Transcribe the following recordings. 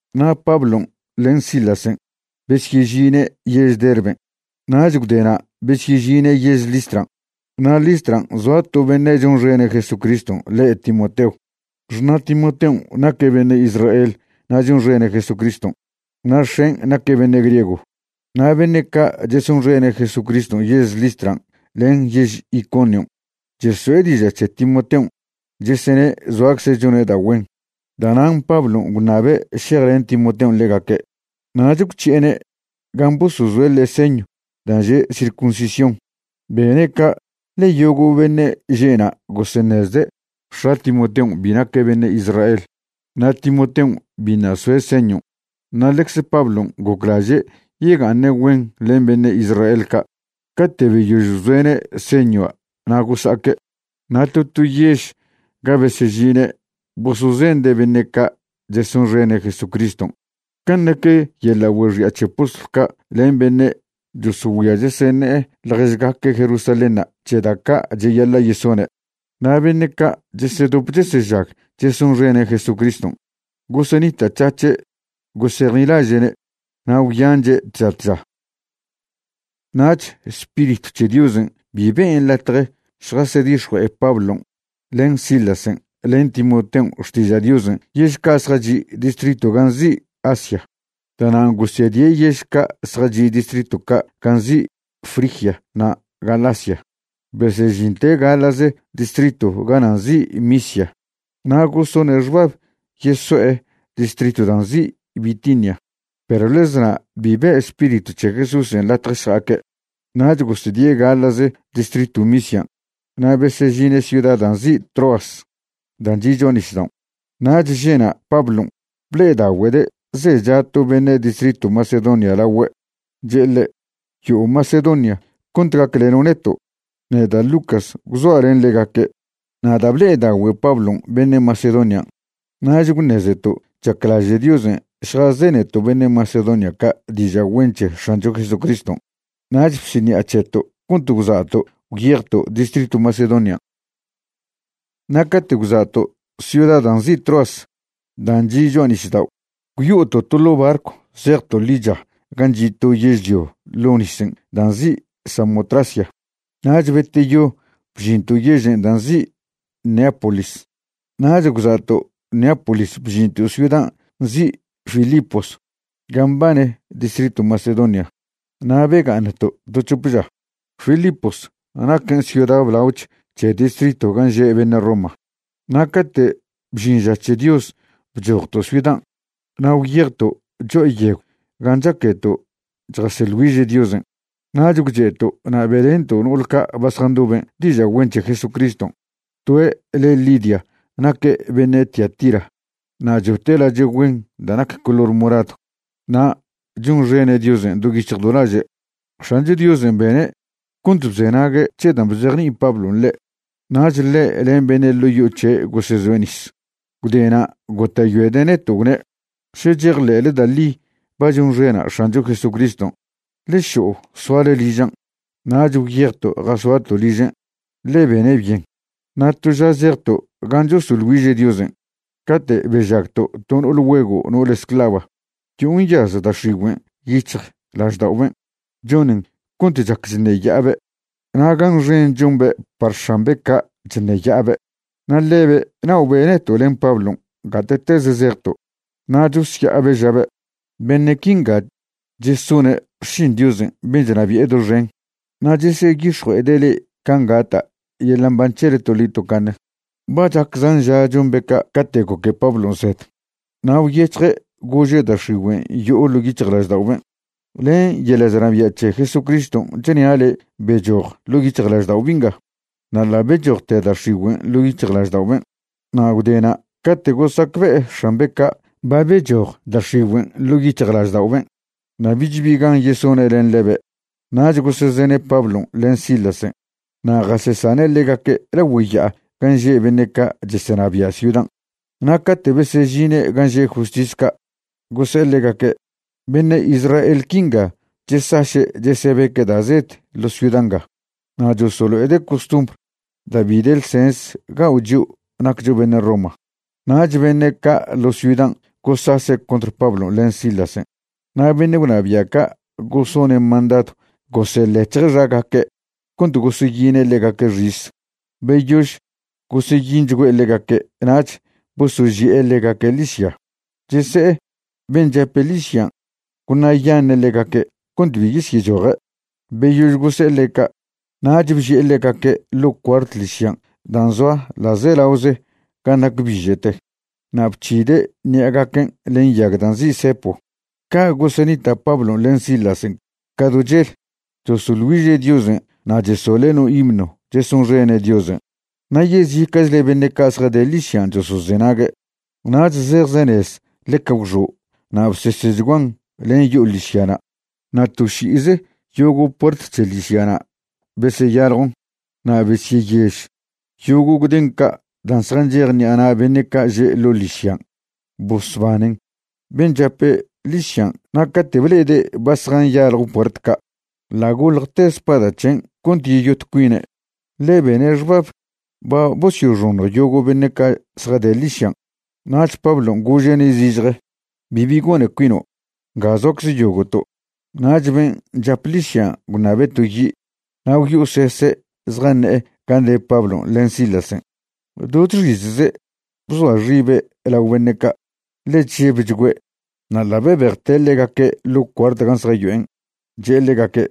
Na' Pablon' len Silasen' besyežine' yež Derben' nach gwdena' besyežine' yež Listran'. Na' Listran' zoa to beṉe' chonxene' Jesucriston' le' Timoteo. Xṉa' Timoteon' naque' beṉe' Israel na' chonxene' Jesucriston', na' x̱en' naque' beṉe' griego. Na' beṉe' ca' chesonxene' Jesucriston' yež Listran' len yež Iconion' cheso'e diža' c̱he Timoteon' chesene' zoacze' chone' da' güen. Da'nan' Pablon' gwṉabe' šejlen Timoteon' ḻegaque', nach gwc̱hi'ene' gan' bosozoe' ḻe' señw dan' že' circuncisión. Bene' ca' ḻe yogo' beṉe' že' na' goseṉezde' x̱a Timoteon' bi naque' beṉe' Israel na' Timoteon' biṉa' soe' señon', na' ḻecze Pablon' goclaže' yega'aṉe' güen len beṉe' Israel ca'. Cate' beyož bzoe'ne' señua' na' gosa'aque'. Na' to to yež ga besežine' bosozende' beṉe' ca' chesonxene' Jesucriston' can' nac yeḻa' güexi'a c̱he postlw ca' len beṉe' chosogüia cheseṉe'e ḻježgaque' Jerusalénṉa' c̱he da' ca' cheyaḻa' yesone'. Na' beṉe' ca' chesedop chesežag chesonxene' Jesucriston' gosenita'c̱hac̱he' gosejnilaže'ne' na' gwyanche' tža tža. Nach Spiritw c̱he Diosen' bi ben' latje šjasedix̱jue'e Pablon' len Silasen' len Timoteon' xtiža' Diosen' yež ca' zjachi' distritw gan' nzi' Asia. Da'nan' gosedie' yež ca' zjachi' distritw ca' gan' nzi' Frigia na' Galacia. Besežinte' gaḻa'ze distritw gana' nzi' Misia na' gosone' xbab yeso'e distritw da' nzi' Bitinia, perw ḻez na' bi be' Spiritw c̱he Jesúsen' latje šja'aque'. Nach gosedie' gaḻa'ze distritw Misian' na' besežine' ciuda dan' nzi' Troas dan' chi' cho'a nisdaon'. Nach že'na' Pablon' ble'edagüede' zecha to beṉe' distritw Macedonia lagüe', che'e ḻe': “Yo'o Macedonia cont gacleno' neto'.” Neda' Lucas gwzoa' len ḻegaque' na' da' ble'edagüe Pablon' beṉe' Macedonian', nach gwṉezeto' chaclaže' Diosen' šjazeneto' beṉe' Macedonia ca' diža' güen c̱he X̱ancho Jesucriston'. Nach bsiṉi'a c̱heto' cont gwza'to' gwyejto' distritw Macedonian'. Na' cate' gwza'to' ciuda da' nzi' Troas dan' chi' cho'a nisdao' gwyo'oto' to ḻo' barcw zejto' ḻicha gan' chi' to yežlio ḻo' nisen' dan' nzi' Samotracia, nach beteyo bžinto' yežen' dan' nzi' Neápolis. Nach gwza'to' Neápolis bžinto' ciudan' nzi' Filipos gan' mbane distritw Macedonia na' bega'aṉto' to c̱hop ža. Filipos naquen ciuda blaoch c̱he distriton' gan' že' beṉe' Roma. Na' cate' bžin ža c̱he Dios bchojto' ciudan' na' gwyejto' cho'a yegw gan' chaqueto' chjaseḻ güiže' Diosen', nach gwche'to' na' be'lento' no'ol ca' ba zjandoben' diža' güen c̱he Jesucriston'. Toe' le Lidia naque' beṉe' Tiatira na' chote' lache' güen da' nac color moradw, na' chonxene' Diosen' do yic̱hj do laže'. X̱ancho Diosen' bene' cont bzenague' c̱he dan' bzejni'i Pablon' ḻe'. Nach ḻe' len beṉe' ḻo' yo'o c̱he' gosezoe' nis. Gwdena' gota'yoede' neto' gwne': ―Še chejḻe'le da' ḻi ba chonxena' X̱ancho Jesucriston', ḻe šo'o soale ližan'. Nach gwyejto' jasoato' ližen', ḻe bene' byen. Na' to ža zejto' gan' chosoḻ güiže' Diosen' cate' bežagto' to no'ol güego' no'ole esclava. Yo'o nyaz da' x̱igüen' yic̱hjlažda'oben' chonen cont chac chṉeya'abe', na' gan xen chombe' par x̱ambe' ca' chṉeya'abe'. Na' ḻebe' na'obe' neto' len Pablon' gate'tez zejto', na' chosya'abe' žabe': ―Beṉe' quinga chesone' xšin Diosen' ben' chnabi'e doxen, na' cheseyix̱jue'ede' le'e can' gata' yeḻa' mban c̱hele toḻi tocaṉe. Ba chac zan ža chombe' ca' cate' goque Pablon' zed, na' gwyec̱hje' gože' da' x̱igüen' yo'o ḻo' yic̱hjlažda'oben': ―Len yeḻa' chnabia' c̱he Jesucriston' chnia' le' bechoj ḻo' yic̱hjlaždao' bi'nga. Na' ḻa' bechojte da' x̱igüen' ḻo' yic̱hjlažda'oben'. Na' gwdena' cate' gosacbe'e x̱ambe' ca' ba bechoj da' x̱igüen' ḻo' yic̱hjlažda'oben' na' bich bi gan yesone' len ḻebe', nach gosezene' Pablon' len Silasen' na' jasesane' ḻegaque' lagüe ya'a gan' že' beṉe' ca' chesenabia' ciudan'. Na' cate' besežine' gan' že' justis ca', gose'e ḻegaque': ―Beṉe' Israel quinga chesaše' chesebeque' da' zed ḻo' ciuda nga. Na' chosolo'ede' costumbr da' bi de ḻsens gao' chio' naccho beṉe' Roma. Nach beṉe' ca' ḻo ciudan' gosase' contr Pablon' len Silasen', na' beṉe' gwnabia' ca' gosone' mandadw goseḻec̱hje' xagaque' cont goseyine' ḻegaque' xis. Beyož goseyinchgüe' ḻegaque' nach bosoži'e ḻegaque' ḻižya, chese'e ben' chape' ḻižyan' gwṉa'yaṉe' ḻegaque' cont bi yesyechoje'. Beyož gose'e ḻe' ca', nach bži'e ḻegaque' ḻo' cuart ḻižyan' dan' zoa ḻa'zelaoze gan' nac biže'te na' bc̱hide' ṉi'agaquen' len yag dan' nzi' cepo. Ca' gosenita' Pablon' len Silasen' ca do chel, chosoḻ güiže' Diosen' na' chesoḻe' no himno chesonxene' Diosen', na' yezica'chle beṉe' ca' zjade ḻižyan' chosozenague'. Nach zejzenez ḻeca gwxo' na' bsesechguan len yo'o ḻižyana'. Na' to ši'ize yogo' puert c̱he ḻižyana' beseyaljon na' besyeyež yogo' gden ca' dan' zjanchej ṉi'a na' beṉe' ca' že' ḻo' ḻižyan'. Bosbanen ben' chape' ḻižyan' na' cate' ble'ede' ba zjanyaljo puert ca', ḻa' goḻjte spada c̱hen' cont yeyot cuine', ḻe bene' xbab ba bosyoxoṉj yogo' beṉe' ca' zjade ḻižyan'. Nach Pablon' gože'ne' zižje: ―Bibi gone cuino'. Nga zoacze yogo'to'. Nach ben' chap ḻižyan' gwṉabe' to yi', na' gwyo'osese' zjaṉe'e gan' de Pablon' len Silasen'. Do chxizze' bzoa xibe' lao beṉe' ca', ḻe chžebchgüe'. Na' ḻa' bebejte' ḻegaque' ḻo cuart gan' zjayo'en', che'e ḻegaque':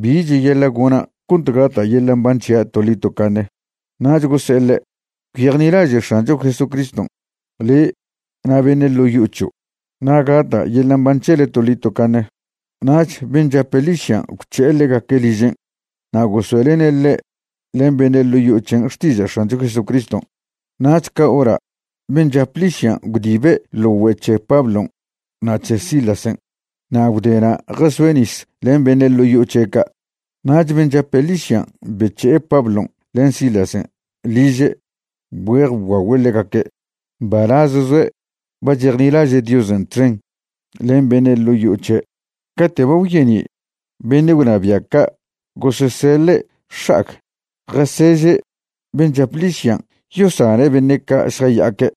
―¿Bi cheyaḻa' gona' cont gata' yeḻa' mban c̱hia' toḻi tocaṉe? Nach gose'e ḻe': ―Gwyejnilaže' X̱ancho Jesucriston', le' na' beṉe' ḻo' yo'o c̱hio', na' gata' yeḻa' mban c̱hele toḻi tocaṉe. Nach ben' chape' ḻižyan' gwc̱he'e ḻegaque' ližen' na' gosoe'lene' ḻe' len beṉe' ḻo' yo'o c̱hen' xtiža' X̱ancho Jesucriston'. Nach ca hora' ben' chap ḻižyan' gwdibe' ḻo güe' c̱he Pablon' na' c̱he Silasen', na' gwdena' jasoe' nis len beṉe' ḻo' yo'o c̱he' ca'. Nach ben' chape' ḻižyan' bec̱he'e Pablon' len Silasen' liže' bgüe'ej bguagüe' ḻegaque'. Mbalaz zoe' ba chejnilaže' Diosen' txen len beṉe' ḻo' yo'o c̱he'. Cate' ba gwyeni' beṉe' gwnabia' ca' goseseḻe' x̱a'ag jaseže' ben' chap ḻižyan' yosane' beṉe' ca' šjaya'aque'.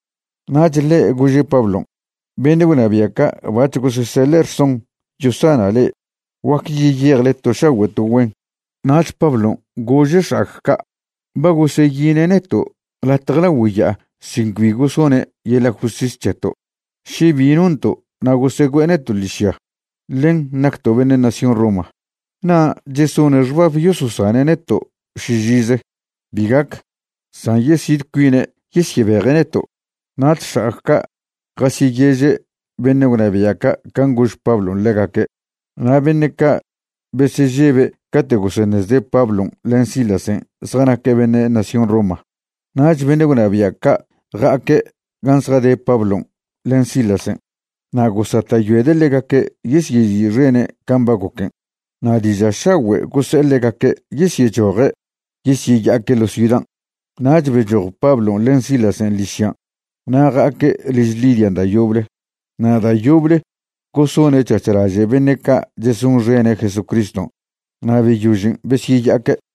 Nach ḻe' gože' Pablon': ―Beṉe' gwnabia' ca' bac̱h goseseḻe' rson yosana' le'e. Guac yeyejle to šagüe' to güen. Nach Pablon' gože' x̱a'ag ca': ―Ba goseyine' neto' latje lagüe ya'a sin cbi gosone' yeḻa' justis c̱heto' še bi nonto' na' gosegüe'e neto' ḻižya, ḻen nacto' beṉe' nación Roma. ¿Na' chesone' xbab yososane' neto' šižize? Bi gac, san yesid cuine' yesyebeje' neto'. Nach x̱a'ag ca' jasyeyeže' beṉe' gwnabia' ca' can' gož Pablon' ḻegaque'. Na' beṉe' ca' besežebe' cate' goseṉezde' Pablon' len Silasen' zjanaque' beṉe' nación Roma. Nach beṉe' gwnabia' ca' ja'aque' gan' zjade Pablon' len Silasen' na' gosata'yoede' ḻegaque' yesyezi'xene' can' ba goquen', na' diža' šagüe' gose'e ḻegaque' yesyechoje' yesyeya'aque' ḻo ciudan'. Nach bechoj Pablon' len Silasen' ḻižyan' na' ja'aque' liž Lidian' da' yoble, na' da' yoble gosone' c̱hac̱h laže' beṉe' ca' chesonxene' Jesucriston' na' beyožen' besyeya'aque'.